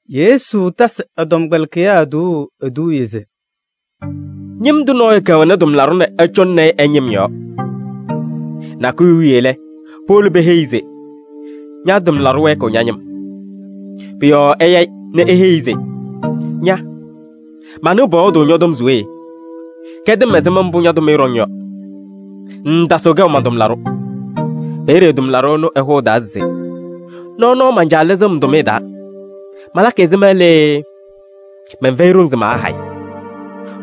Yesu tasɩ ɛ-tɔmkpɛlɩkɩyaa tuuu eduuye se: “Ñɩm tʋ nɔɔyʋ kɛwɛnɩ tʋmlaɖʋ nɛ ɛcɔŋnɩ-ɩ ɛ-ñɩm yɔɔ. Nakʋyʋ wiye lɛ, powolo peheyi-i se: ‘Ña-tʋmlaɖʋ wɛɛkɩɣ ña-ñɩm.’ Pʋ-yɔɔ ɛya-ɩ nɛ eheyi-i se: ‘Ña! Manɩɣ pɔyɔɔdʋʋ ñɔ-tɔm se we? Kɛdɩ-m ɛzɩma mbʋ ña-tʋmɩyɛ ɖɔŋ yɔ. Ŋŋtasɩɣ kɛʋ man-tʋmlaɖʋ!’ Peeye tʋmlaɖʋ ɛnʋ ɛhʋ ɛ-taa se: ‘Nɔɔnɔɔ man-caa lɩzɩɣ-m tʋmɩyɛ taa, malakɩ ɛzɩma lee? Mɛnfɛyɩ ɖoŋ se maahayɩ.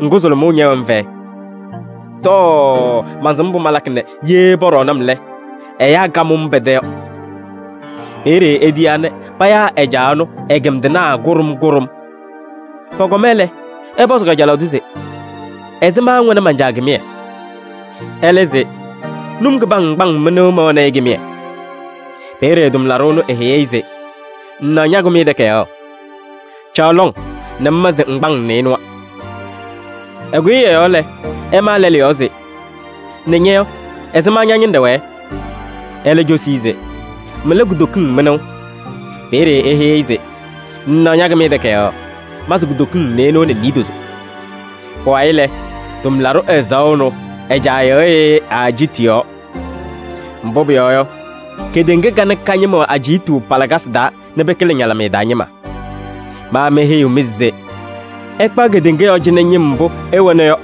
Ŋgʋ, sʋlʋmʋʋ ñɛwɛ-m fɛyɛ. Tɔɔ! Mansɩm mbʋ malakɩ nɛ ye pɔɖɔɔnɩ-m lɛ, ɛyaa kamʋ-m pɛ-tɛ yɔ.’ Peeye etiyaa nɛ payaa ɛ-caa ɛnʋ ɛ-kɩndɩnaa kʋɖʋm kʋɖʋm. Pɔkɔma lɛ, ɛpɔzɩ kajalaɣ tʋ se: ‘Ɛzɩma ŋwɛnɩ man-caa kɩmɩyɛ?’ Ɛlɛ se: ‘Num kɩpam ŋkpaŋ mɩnʋʋ mɛwɛnɩ-ɩ kɩmɩyɛ.’ Peeye tʋmlaɖʋ ɛnʋ eheyi-i se: ‘Ŋŋnaɣ ña-kɩmɩyɛ takayaɣ! Caɣ lɔŋ nɛ ŋma se ŋgbaŋ nɩɩnʋwa.’ Ɛkʋyɩ ɛ-yɔɔ lɛ, ɛmaa lɛlʋ yɔɔ se: ‘Nɛ ña-yɔ, ɛzɩma ña-ñɩnɖɛ wɛɛ?’ Ɛlɛ cosi-i se: ‘Mɩla kutokiŋ mɩnʋʋ.’ Peeye eheyi-i se: ‘Ŋŋnaɣ ña-kɩmɩyɛ takayaɣ! Ma se kutokiŋ nɩɩnʋwa nɛ niidozo.’ Pʋwayɩ lɛ, tʋmlaɖʋ ɛzaɣʋ ɛnʋ ɛ-caa yɩɣyɩ-ɩ ɛ-ajiitu yɔɔ. Mbʋ pʋyɔɔ yɔ, kedeŋa kanɛ ka-ñɩma wɛ ajiitu pa-lakasɩ taa nɛ pɩkɩlɩ ñalɩmɩyɛ taa ñɩma. Ma meheyiɣ-mɩ se: ɩkpaɣ kedeŋa yɔɔ cɩnɛ ñɩm mbʋ ɩwɛna yɔ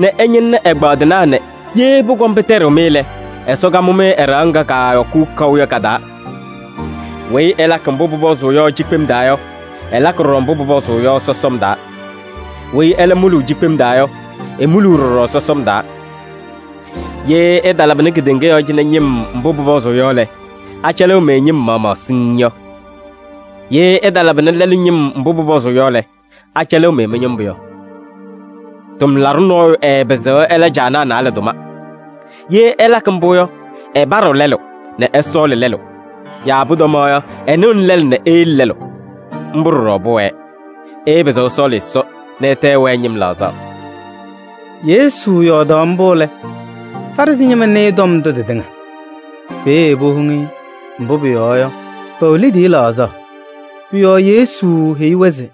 nɛ ɩñɩnɩnɩ ɛgbaadɩnaa nɛ ye pʋkɔm pɩtɛɖɩɣ-mɩ lɛ, Ɛsɔ kamʋ-mɩ ɛ-ɖɩɣa ŋga kaayɔkʋʋ kaʋ yɔ ka-taa. Weyi ɛlakɩ mbʋ pʋpɔzʋʋ yɔ cikpem taa yɔ, ɛlakɩ ɖɔɖɔ mbʋ pʋpɔzʋʋ yɔ sɔsɔm taa. Weyi ɛlɛ muluu cikpem taa yɔ, emuluu ɖɔɖɔ sɔsɔm taa. Ye ɩtalabɩnɩ kedeŋa yɔɔ cɩnɛ ñɩm mbʋ pʋpɔzʋʋ yɔ lɛ, acɛlɩɣ-mɩ ñɩm maɣmaɣ siŋŋ yɔ? Ye ɩtalabɩnɩ lɛlʋ ñɩm mbʋ pʋpɔzʋʋ yɔ lɛ, acɛlɩɣ-mɩ mɩ-ñɩmbʋ yɔ? Tʋmlaɖʋ nɔɔyʋ ɛɛpɩzɩɣ ɛla caanaa naalɛ tʋma. Ye ɛlakɩ mbʋ yɔ, ɛpaɖɩɣ lɛlʋ nɛ ɛsɔɔlɩ lɛlʋ. Yaa pʋtɔmaɣ yɔ, ɛnɩɣnɩ lɛlʋ nɛ eyele lɛlʋ. Mbʋ ɖɔɖɔ pʋwɛɛ: ɩɩpɩzɩɣ ɩsɔɔlɩ Ɛsɔ nɛ ɩtɛ ɩwɛɛ ñɩm laɣzaɣ.” Yesu yɔɔdaɣ mbʋ lɛ, Farɩsɩ ñɩma nɩɩ tɔm ndʋ tɩtɩŋa. Peeye powoŋ-i, mbʋ pʋyɔɔ yɔ, pɛwɛ liidiye laɣzaɣ. Pʋ-yɔɔ Yesu heyi-wɛ se: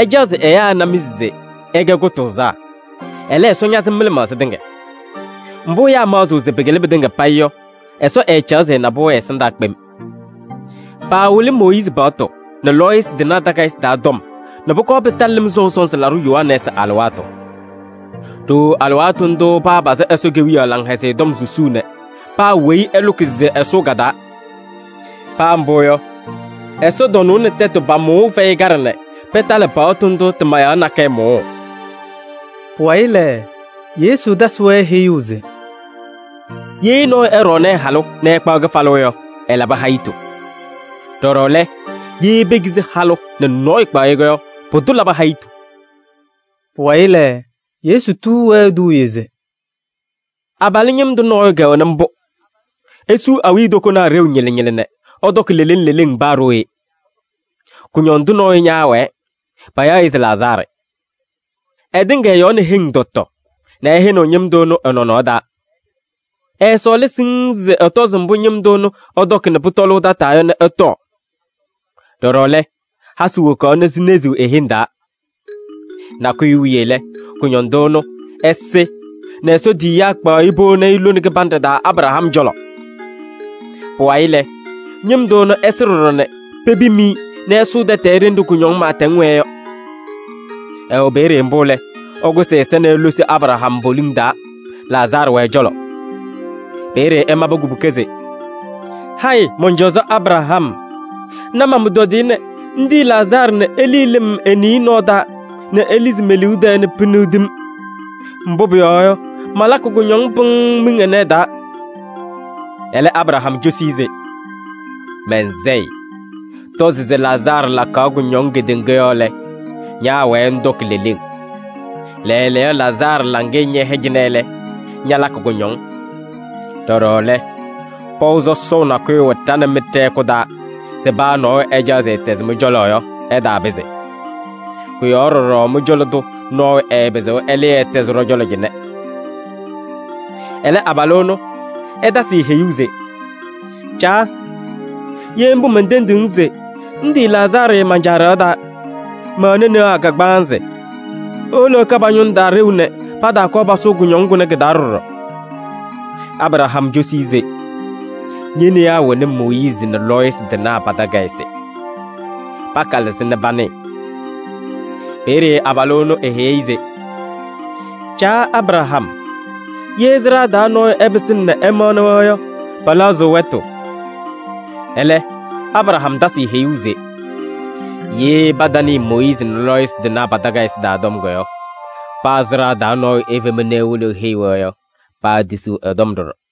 “Ɩcaɣ se ɛyaa ɩna-mɩ se ɩkɛ kʋtʋʋzaa, ɛlɛ, Ɛsɔ ñasɩm mɩ-lɩmaɣza tɩŋa. Mbʋ ɛyaa maɣzɩɣ se pɩkɩlɩ pɩtɩŋa payɩ yɔ, Ɛsɔ ɛɛcaɣ se ɛna-pʋ ɛ-ɛsɩndaa kpem. Paawɩlɩ Mooyiizi paɣtʋ nɛ lɔɔyɩsɩ tɩnaa takayɩsɩ taa tɔm nɛ pʋkɔɔ pɩtalɩ Lɩm Sɔʋ Sɔnzɩ Laɖʋ Yohanɛɛsɩ alɩwaatʋ. Ɖooo alɩwaatʋ ndʋʋ papazɩ Ɛsɔ Kewiyaɣ Laŋhɛzɩyɛ Tɔm susuu nɛ paa weyi ɛlʋkɩ se ɛsʋʋ ka-taa. Paa mbʋ yɔ, ɛsɔtɔnʋʋ nɛ tɛtʋ pa-mʋʋʋ fɛyɩ kaɖɛ nɛ pɩtalɩ paɣtʋ ndʋ tɩ-mayaɣ nakɛyɛ mʋʋʋ.” Pʋwayɩ lɛ, Yesu tasɩ-wɛ heyuu se: “Ye nɔɔyʋ ɛɖɔɔnɩ ɛ-halʋ nɛ ɛkpaɣ kɩfalʋ yɔ, ɛlabɩ hayitu. Ɖɔɖɔ lɛ, ye pekizi halʋ nɛ nɔɔyʋ kpaɣ-ɩ yɔ, pʋdʋ labɩ hayitu.” Pʋwayɩ lɛ, Yesu tuu-wɛ eduuye se: “Abalʋ ñɩm tʋ nɔɔyʋ kɛwɛnɩ mbʋ, esuu awiitokonaa ɖeu ñɩlɩ ñɩlɩ nɛ ɛtɔkɩ leleŋ leleŋ paa ɖooye. Kʋñɔndʋ nɔɔyʋ ñaawɛɛ, payaɣ-ɩ se Lazaarɩ. Ɛtɩŋa ɛ-yɔɔ nɛ heŋ tɔ tɔ nɛ ɛhɛnɩɣ ñɩm tʋ ɛnʋ ɛ-nɔnɔɔ taa. Ɛɛsɔɔlaa siŋŋ se ɛtɔzɩ mbʋ ñɩm tʋ ɛnʋ ɛtɔkɩ nɛ pʋtɔlʋʋ tataa yɔ nɛ ɛtɔɔ. Ɖɔɖɔ lɛ, hasɩ wokaɣ nɛ sineziɣ e-heŋ taa. Nakʋyʋ wiye lɛ, kʋñɔndʋ ɛnʋ ɛsɩ nɛ Ɛsɔ tiyiyaa kpaɣ-ɩ powoni-i lone kɩbanɖɛ taa Abraham cɔlɔ. Pʋwayɩ lɛ, ñɩm tʋ ɛnʋ ɛsɩ ɖɔɖɔ nɛ pebim-i nɛ ɛsʋʋ tɛtɛɛ ɖenɖe kʋñɔŋ pɩɩtɛŋ wɛɛ yɔ. Ɛwɛ peeye mbʋ lɛ, ɛkʋsɩ ɛ-ɛza nɛ elosi Abraham poliŋ taa, Lazaarɩ wɛ ɛ-cɔlɔ. Peeye ɛmabɩ kubuka se: ‘Hayɩ mɔn-cɔzɔ Abraham! Na man-pʋtɔdɩyɛ nɛ ŋtiyi Lazaarɩ nɛ elii lɩm e-niye nɔɔ taa nɛ elizi me-liu tɛɛ nɛ piniɣdi-m. Mbʋ pʋyɔɔ yɔ, malakɩ kʋñɔŋ pɩŋŋ miŋ ɛnɛ ɛ-taa.’ Ɛlɛ, Abraham cosi-i se: ‘Man-sayɩ! Tɔzɩ se Lazaarɩ lakaɣ kʋñɔŋ kedeŋa yɔɔ lɛ, ñaawɛɛ ŋtɔkɩ leleŋ. Lɛɛlɛɛyɔ Lazaarɩ laŋɩyɛ ñɛhɛ cɩnɛ lɛ, ñalakɩ kʋñɔŋ. Ɖɔɖɔ lɛ, pɔʋ sɔsɔʋ nakʋyʋ wɛ ɖa nɛ mɩ ɖɛ-hɛkʋ taa se paa nɔɔyʋ ɛcaɣ se ɛtɛzɩ mɩ-cɔlɔ yɔ, ɛtaapɩzɩ. Kʋ-yɔɔ ɖɔɖɔ mɩ-cɔlɔ tʋ nɔɔyʋ ɛɛpɩzɩɣ ɛlɩɩ ɛtɛzɩ ɖɔ-cɔlɔ cɩnɛ.’ Ɛlɛ abalʋ ɛnʋ ɛtasɩ-ɩ heyuu se: ‘Caa! Ye mbʋ mentendiɣ-ŋ se ŋtiyi Lazaarɩ man-caa ɖɩɣa taa. Mɛwɛnɩ newaa kagbaanzɩ. Ewolo ɛka pa-ñʋŋ taa ɖeu nɛ pataakɔɔ pasʋʋ kʋñɔŋ kʋnɛ kɩ-taa ɖɔɖɔ.’ Abraham cosi-i se: ‘Ñe-newaa wɛnɩ Mooyiizi nɛ lɔɔyɩsɩ tɩnaa pa-takayɩsɩ. Pakalɩ-sɩ nɛ panɩɩ.’ Peeye abalʋ ɛnʋ eheyi-i se: ‘Caa Abraham! Ye sɩɖaa taa nɔɔyʋ ɛpɩsɩna nɛ ɛmaɣnɩ-wɛ yɔ, pɛlɛɣzɩɣ wɛtʋ.’ Ɛlɛ Abraham tasɩ-ɩ heyuu se: ‘Ye patanɩɩ Mooyiizi nɛ lɔɔyɩsɩ tɩnaa pa-takayɩsɩ taa tɔm yɔ, paa sɩɖaa taa nɔɔyʋ efema nɛ ewolo eheyi-wɛ yɔ, paatisiɣ ɛ-tɔm ɖɔɖɔ.’”